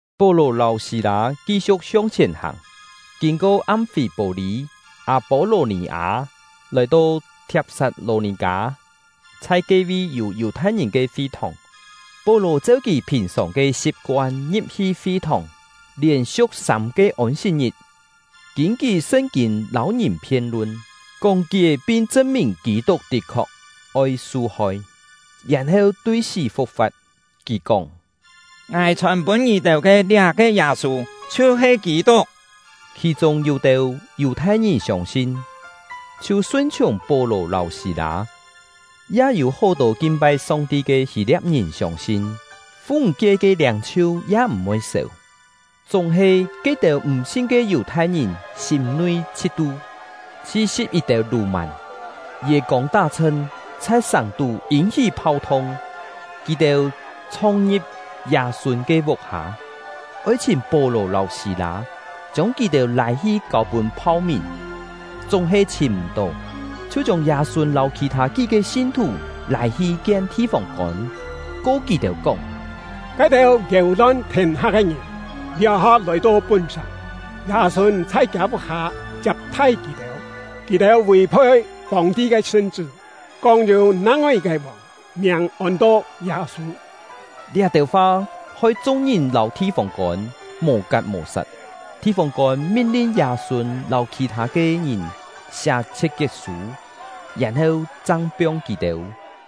Pó-lò lâu Sî-lâ ki-siu̍k hiong-chhièn hàng, kîn-ko Am-fî-pô-lî, Â-pô-lò-nì-â, lòi-to Thiap-sat-lò-nì-kâ, chhai ke-vi yû Yù-thai-ngìn ke fi-thòng. Pó-lò cheu kì phìn-sòng ke si̍p-koan ngi̍p-hi fi-thòng, lièn-siu̍k sâm-ke Ôn-sit-ngit, kîn-kí Sṳn-kîn lâu ngìn phien-lun, kóng-kié pin chṳn-mìn Kî-tuk tit-khok oi su-hoi, yèn-heu tui sí fu̍k-fa̍t. Kì kóng: “Ngài chhòn-pûn ngì-têu ke liá-ke Yâ-sû, chhiu-he Kî-tuk.” Khì-chûng yû-têu Yù-thai-ngìn siông-sin, chhiu sun-chhiùng Pó-lò lâu Sî-lâ; ya yû hó-tô kin-pai Song-ti ke Hî-lia̍p-ngìn siông-sin, fu-ńg-kie ke liâng-chhiu ya m̀-voi séu. Chúng-he, ke-têu m̀-sin ke Yù-thai-ngìn sîm-nui chhit-tu, chhi-si̍p yit-têu lù-màn, yê-kông tá-chhṳn, chhai sàng-tú yîn-hí phau-thung. Kì-têu chhong-ngi̍p Yâ-sûn ke vuk-hâ, oi chhìm Pó-lò lâu Sî-lâ, chiông kì-têu lâi-hi kâu-pûn phau-mìn; chúng-he chhìm m̀-tó, chhiu chiông Yâ-sûn lâu khì-thâ kí-ke sin-thù lâi-hi kien thi-fông-kôn, ko kì-têu kóng: “Ke-têu yéu-lon thiên-ha ke ngìn, liá-ha lòi-to pún-sàng, Yâ-sûn chhai kiâ vuk-hâ chiap-thai kì-têu! Kì-têu vì-phoi Fòng-ti ke sṳn-chṳ́, kóng yû nang-ngoi yit-ke vòng, miàng ôn-to Yâ-sû.” Liá-têu fa hoi chung-ngìn lâu thi-fông-kôn mò-kat mò-sat. Thi-fông-kôn min-lin Yâ-sûn lâu khì-thâ ke ngìn siá chhiet-kiet-sû, yèn-heu chang piong kì-têu.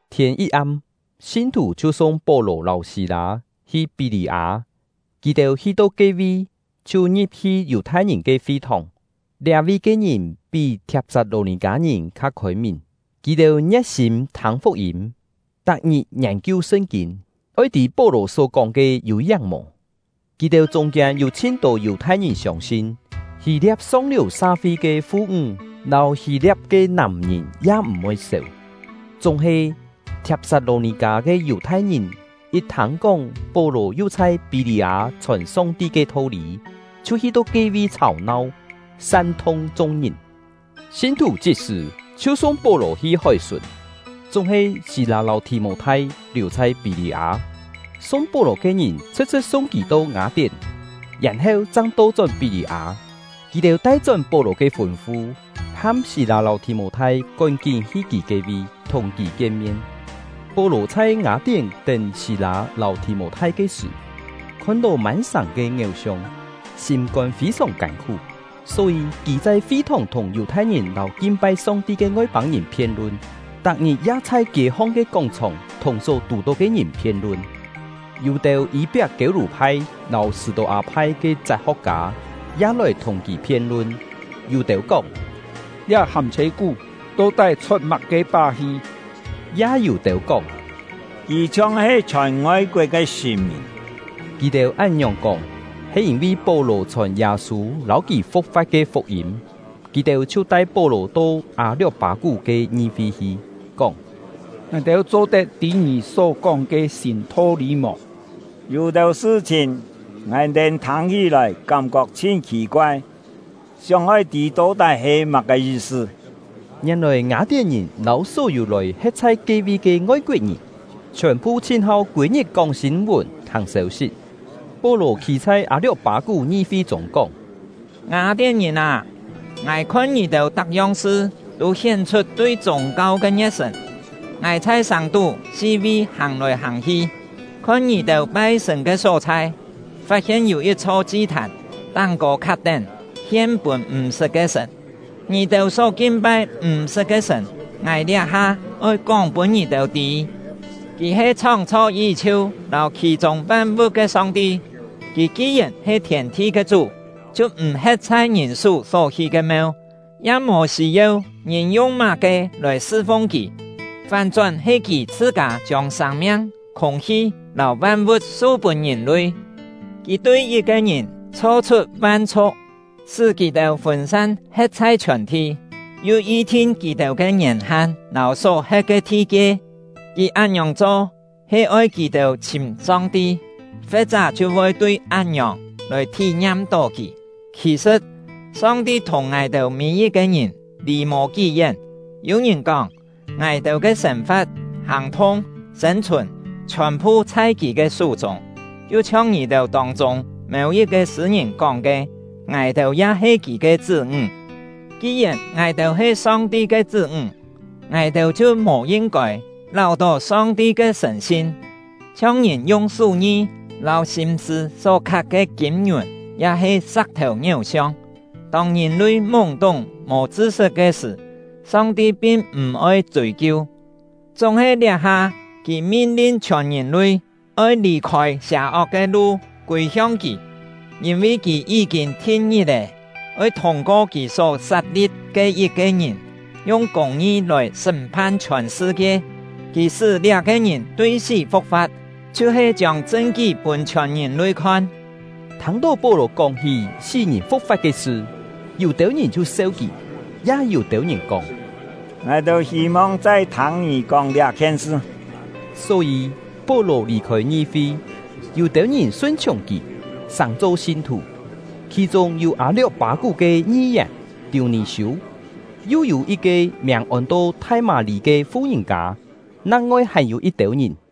Thiên yit-am, sin-thù chhiu sung Pó-lò lâu Sî-lâ hi Pí-lî-â. Kì-têu hi-to ke-vi, chhiu ngi̍p-hi Yù-thai-ngìn ke fi-thòng. Liá-vi ke ngìn pí Thiap-sat-lò-nì-kâ-ngìn kha khôi-mìn. Kì-têu ngie̍t-sîm thâng fuk-yîm, tak-ngit ngiên-kiu Sṳn-kîn, oi tî Pó-lò só-kóng ke yû-yáng mò. Kì-têu chûng-kiên yû chhin-tô Yù-thai-ngìn siông-sin; Hî-lia̍p song-liù sa-fi ke fu-ńg lâu Hî-lia̍p ke nàm-ngìn ya m̀-voi séu. Chúng-he, Thiap-sat-lò-nì-kâ ke Yù-thai-ngìn yit thâng-kóng Pó-lò yu chhai Pí-lî-â chhòn Song-ti ke tho-lî, chhiu hi-to ke-vi chhàu-nau, san-thung chung-ngìn. Sin-thù chit-sṳ̀ chhiu sung Pó-lò hi hói-sùn; chúng-he Sî-lâ lâu Thì-mô-thai liù chhai Pí-lî-â. Sung Pó-lò ke ngìn chhṳ̍t-chhṳ̍t sung kì to Ngâ-tién, yèn-heu chang to-chón Pí-lî-â; kì-têu tai-chón Pó-lò ke fûn-fu, ham Sî-lâ lâu Thì-mô-thai kón-kín hi kì ke-vi, thùng kì kien-mien. Pó-lò chhai Ngâ-tién tén Sî-lâ lâu Thì-mô-thai ke sṳ̀, khon-tó mân sàng ke ngiéu-siong, sîm-kôn fî-sòng kân-khú. Só-yî, kì chhai fi-thòng thùng Yù-thai-ngìn lâu kin-pai Song-ti ke Ngoi-pâng-ngìn phien-lun, tak-ngit ya chhai kiê-hong ke kóng-chhòng thùng só tù-tó ke ngìn phien-lun. Yû-têu Yî-piak-kiêu-lû-phai lâu Sṳ̂-tô-â-phai ke chat-ho̍k-kâ ya lòi thùng kì phien-lun. Yû-têu kóng: “Liá hâm-chhê-kú to-tái chhot má-ke pá-hi?” Ya yû-têu kóng: “Kì chhiong-he chhòn ngoi-koet ke sṳ̀n-mìn.” Kì-têu án-ngiòng kóng, he yîn-vi Pó-lò chhòn Yâ-sû lâu kì fu̍k-fa̍t ke fuk-yîm. Kì-têu chhiu tai Pó-lò to Â-lio̍k-pâ-kú ke ngi-fi hi, kóng: “Ngài-têu cho-tet tî ngì só kóng ke sîn tho-lî mò? Yû-têu sṳ-chhìn ngài-têu thâng-hí-lòi kám-kok chhin khì-koai, sióng-oi tî to-tái he má-ke yi-sṳ.” (Ngièn-lòi Ngâ-tién-ngìn lâu só-yû lòi he̍t chhai ke-vi ke ngoi-koet-ngìn, chhiòn-phu chhin-hau kûi-ngit kóng sîn-vùn thâng sêu-sit.) Pó-lò khî chhai Â-lio̍k-pâ-kú ngi-fi chûng kóng: “Ngâ-tién-ngìn â! Ngài khon ngì-têu tak-yong sṳ tû hién-chhut tui chûng-kau ke ngie̍t-sṳ̀n. Ngài chhai sàng-tú si-vi hàng-lòi hàng-hi, khon ngì-têu pai-sṳ̀n ke só-chhai, fat-hien yû yit-chho chi-thàn, táng-kô khat-tén ‘Hien pûn m̀-sṳt ke Sṳ̀n’. Ngì-têu só kin-pai m̀-sṳt ke Sṳ̀n, ngài liá-ha oi kóng pûn ngì-têu tî. Kì he chhóng-chho yí-chhiu lâu khì-chûng van-vu̍t ke Song-ti; Kì ki-yèn he thiên-thi ke Chú, chhiu m̀ he̍t chhai ngìn sú só hí ke meu, ya mò sî-yeu ngìn yung má-ke lòi sṳ-fung Kì; fán-chón he Kì chhṳ-kâ chiông sâng-miang, khûng-hi, lâu van-vu̍t su-pûn ngìn-lui. Kì tui yit-ke ngìn chho-chhut van-chhu̍k, sṳ́ kì-têu fûn-san he̍t chhai chhiòn-thi, yu yi-thin kì-têu ke ngièn-han lâu só he̍t ke thi-kie. Kì án-ngiòng cho he oi kì-têu chhìm Song-ti, fe̍t-chá chhiu voi tui án-ngiòng lòi thí-ngiam-tó Kì. Khì-sṳ̍t, Song-ti thùng ngài-têu mî-yit-ke ngìn lì mò kí-yén. Yû ngìn kóng: ‘Ngài-têu ke sên-fa̍t, hàng-thung, sên-chhùn chhiòn-phu chhai Kì ke sú-chûng.’ Yu chhiong ngì-têu tông-chûng mêu-yit-ke sṳ̂-ngìn kóng ke: ‘Ngài-têu ya he Kì ke chṳ́-ńg.’ Ki-yèn ngài-têu he Song-ti ke chṳ́-ńg, ngài-têu chhiu mò yin-kôi láu-tó Song-ti ke sṳ̀n-sin chhiong ngìn yung sú-ngi lâu sîm-sṳ̂ só khat ke kîm-ngiùn ya-he sa̍k-thèu ngiéu-siong. Tông ngìn-lui múng-túng mò chṳ-sṳt ke sṳ̀, Song-ti pin m̀-oi chûi-kiu; chúng-he liá-ha Kì min-lin chhiòn ngìn-lui oi lì-khôi sià-ok ke lu, kûi-hiong Kì. Yîn-vi Kì yí-kîn thin ngit-è, oi thûng-ko Kì só sat-li̍p ke yit-ke ngìn, yung kûng-ngi lòi sṳ́m-phan chhiòn sṳ-kie. Kì sṳ́ liá-ke ngìn tui sí fu̍k-fa̍t, chhiu-he chiông chṳn-kí pûn chhiòn ngìn-lui khon.” Thâng-tó Pó-lò kóng-hí sí-ngìn fu̍k-fa̍t ke sṳ, yû-têu ngìn chhiu seu kì; ya yû-têu ngìn kóng: “Ngài-têu hî-mong chai thâng ngì kóng liá-khien sṳ.” Só-yî, Pó-lò lì-khôi ngi-fi. Yû-têu ngìn sun-chhiùng kì, sàng-cho sin-thù; khì-chûng yû Â-lio̍k-pâ-kú ke ngi-yèn Tiû-nì-siû, yu yû yit-ke miàng ôn-to Thai-mâ-lî ke fu-ngìn-kâ, nang-ngoi hàn-yû yit-têu ngìn.